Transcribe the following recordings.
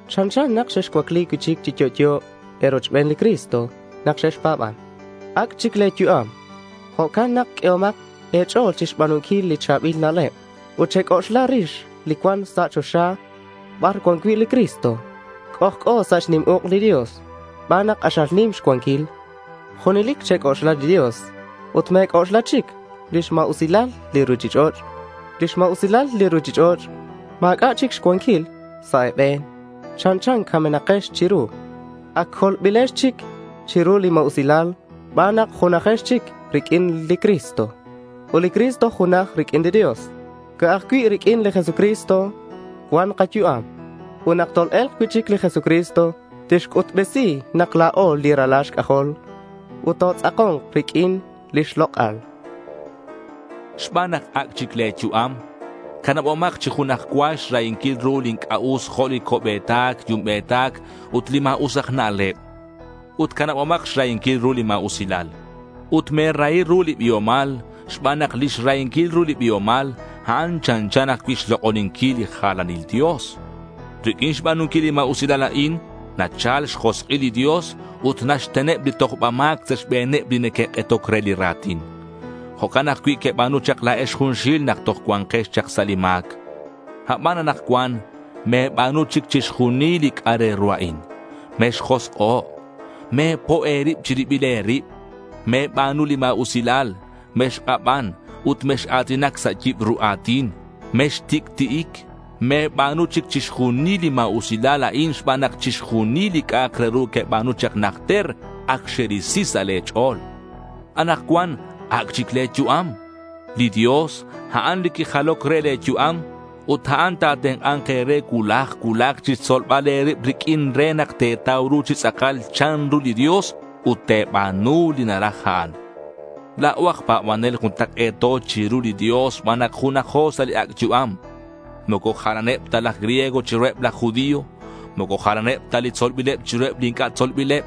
Chanchan nak xexcuacli cui'chic chi yo'yo e̱rochben li Cristo nak xexpa̱ban. Ac' chic le̱ yu'am. Jo'can nak q'uehomak e̱ch'o̱l chixba̱nunquil li cha̱bil na'leb ut chexc'oxlak chirix li cuan sa' choxa bar cuan cui' li Cristo c'ojc'o sa' xnim uk' li Dios xban nak k'axal nim xcuanquil. Junelic chec'oxla li Dios ut me̱c'oxla chic lix ma̱usilal li ruchich'och'. Lix ma̱usilal li ruchich'och' ma̱c'a' chic xcuanquil sa' e̱be̱n. Chanchan camenakex chiru. Ac colbilex chic chiru li ma̱usilal xban nak junajex chic riq'uin li Cristo, ut li Cristo junaj riq'uin li Dios. Ca'aj cui' riq'uin li Jesucristo cuan kayu'am. Ut nak tol-e̱lk cui'chic li Jesucristo tixc'utbesi nak la̱o li ralal xc'ajol, ut totz'ako̱nk riq'uin lix lok'al. Xban nak ac' chic le̱ yu'am, canabomak chi junaj cua xrahinquil ru li inc'a' us jo' li co'be̱tac yumbe̱tac, ut li ma̱us aj na'leb. Ut canabomak xrahinquil ru li ma̱usilal. Ut me̱rahi ru li biomal xban nak li xrahinquil ru li biomal, a'an chanchan ajcui' xlok'oninquil li jalanil dios. Riq'uin xba̱nunquil li ma̱usilal a'in nachal xjosk'il li Dios ut naxteneb li tojba ma̱c sa' xbe̱neb li neque'k'etoc re li ra̱tin. Jo'can ajcui' queba̱nu chak la̱ex junxil nak toj cuanquex chak sa' li ma̱c. Aban anakcuan me̱ba̱nu chic chixjunil li c'a' re ru a'in: mexjosk'o', me̱po' e̱rib chi ribil e̱rib, me̱ba̱nu li ma̱usilal, mexk'aban, ut mex-a̱tinac sa' yibru a̱tin. Mextic'ti'ic. Me̱ba̱nu chic chixjunil li ma̱usilal a'in xban nak chixjunil li c'a'ak re ru queba̱nu chak najter ac xerisi sa' le̱ ch'o̱l. Anakcuan ac' chic le̱ yu'am. Li Dios, a'an li quijaloc re le̱ yu'am ut a'an ta̱tenk'a̱nk e̱re cuulaj cuulaj chixtzolbal e̱rib riq'uin re nak te̱tau ru chi tz'akal chanru li Dios ut te̱ba̱nu li naraj a'an. La̱o aj pa̱banel juntak'e̱to chiru li Dios xban nak junajo sa' li ac' yu'am. Moco jalaneb ta laj griego chiruheb laj judío. Moco jalaneb ta li tzolbileb chiruheb li inc'a' tzolbileb.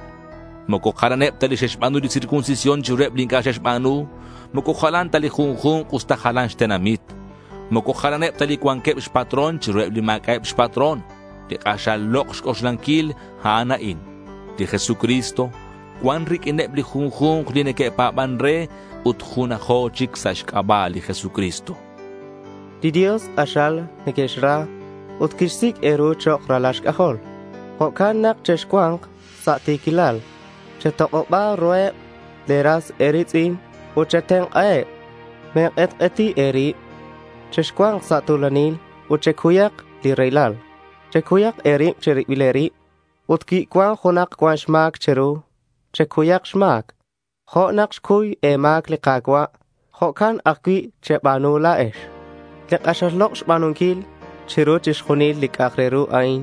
Moco jalaneb ta li xe'xba̱nu li circuncisión chiruheb li inc'a' xe'xba̱nu. Moco jalan ta li junju̱nk usta jalan xtenamit. Moco jalaneb ta li cuanqueb xpatrón chiruheb li ma̱c'a'eb xpatrón. Li k'axal lok' xc'oxlanquil a'an a'in: Li Jesucristo cuan riq'uineb li junju̱nk li neque'pa̱ban re ut junajo chic sa' xc'aba' li Jesucristo. Li Dios k'axal nequexra ut quixsic' e̱ru chok' ralal xc'ajol. Jo'can nak chexcua̱nk sa' ti̱quilal. Chetok'oba ruheb le̱ ras e̱ri̱tz'in ut chetenk'aheb. Me̱k'etk'eti e̱rib. Chexcua̱nk sa' tu̱lanil ut checuyak li raylal. Checuyak e̱rib chiribil e̱rib. Ut cui cuan junak cuan xma̱c che̱ru, checuyak xma̱c. Jo' nak quixcuy e̱ma̱c li Ka̱cua', jo'can ajcui' cheba̱nu la̱ex. Li k'axal lok' xba̱nunquil chiru chixjunil li c'a'ak re ru a'in,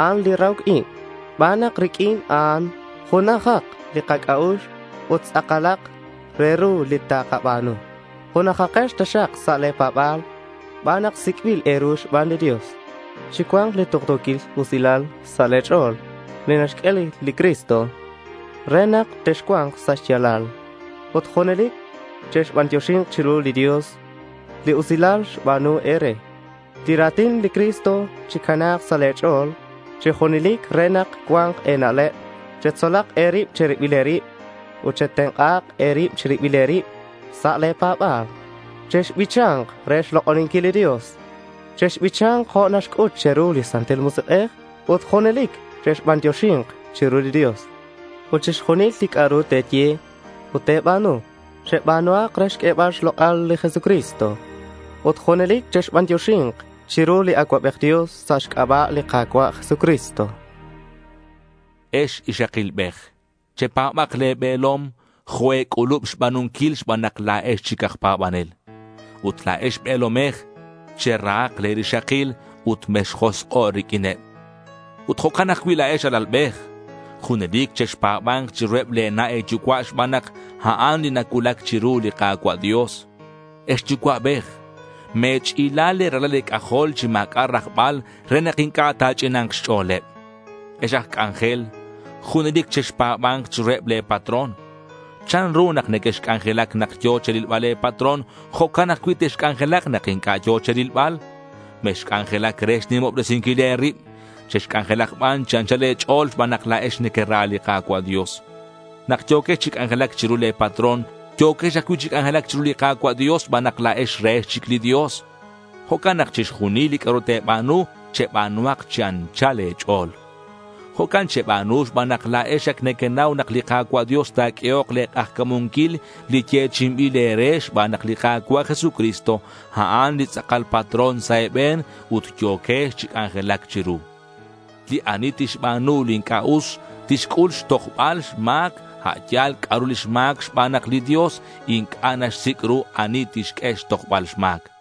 a'an li rahoc ib xban nak riq'uin a'an junajak li kac'a'ux ut tz'akalak re ru li takaba̱nu. Junajakex taxak sa' le̱ pa̱ba̱l xban nak sic'bil e̱ru xban li Dios. Chicua̱nk li tuktu̱quilal sa' le̱ ch'o̱l li naxq'ue li Cristo re nak texcua̱nk sa' xya̱lal. Ut junelic chebantioxi chiru li Dios li usilal xba̱nu e̱re. Li ra̱tin li Cristo chicana̱k sa' e̱ch'o̱l chi junelic re nak cua̱nk e̱na'leb. Chetzolak e̱rib che̱ribil e̱rib ut chetenk'a e̱rib che̱ribil e̱rib sa' le̱ pa̱ba̱l. Chexbicha̱nk re xlok'oninquil li Dios. Chexbicha̱nk jo' naxc'ut che̱ru li Santil Musik'ej ut junelic chexbantioxi̱nk chiru li Dios. Ut chixjunil li c'a'ru te̱ye ut te̱ba̱nu, cheba̱nuhak re xq'uebal xlok'al li Jesucristo. Ut junelic chexbantioxi̱nk chiru li Acuabej Dios sa' xc'aba' li Ka̱cua' Jesucristo. Ex ixakilbej, chepa̱ba̱k le̱ be̱lom jo' e̱c'ulub xba̱nunquil xban nak la̱ex chic aj pa̱banel. Ut la̱ex be̱lomej, cherahak le̱ rixakil ut mexjosk'o' riq'uineb. Ut jo'can ajcui' la̱ex alalbej, junelic chexpa̱ba̱nk chiruheb le̱ na' e̱yucua' xban nak a'an li nacuulac chiru li Ka̱cua' Dios. Ex yucua'bej, me̱ch'ila le̱ ralal e̱c'ajol chi ma̱c'a' rajbal re nak inc'a' ta̱ch'ina̱nk xch'o̱leb. Ex aj c'anjel, junelic chexpa̱ba̱nk chiruheb le̱ patrón. Chanru nak nequexc'anjelac nak yo̱ che̱rilbal le̱ patrón, jo'can ajcui' texc'anjelak nak inc'a' yo̱ che̱rilbal. Mexc'anjelac re xnimobresinquil e̱rib. Chexc'anjelak ban chi anchal le̱ ch'o̱l xban nak la̱ex nequera li Ka̱cua' Dios. Nak yo̱quex chi c'anjelac chiru le̱ patrón, yo̱quex ajcui' chi c'anjelac chiru li Ka̱cua' Dios xban nak la̱ex rehex chic li Dios. Jo'can nak chixjunil li c'a'ru te̱ba̱nu, cheba̱nuhak chi anchal e̱ch'o̱l. Jo'can cheba̱nu xban nak la̱ex ac nequenau nak li Ka̱cua' Dios ta̱q'uehok le̱ k'ajca̱munquil li yechi'inbil e̱re xban nak li Ka̱cua' Jesucristo, a'an li tz'akal patrón sa' e̱be̱n ut yo̱quex chi c'anjelac chiru. Li ani tixba̱nu li inc'a' us tixc'ul xtojbal xma̱c a' yal c'a'ru lix ma̱c xban nak li Dios inc'a' naxsic' ru ani tixq'ue chixtojbal xma̱c.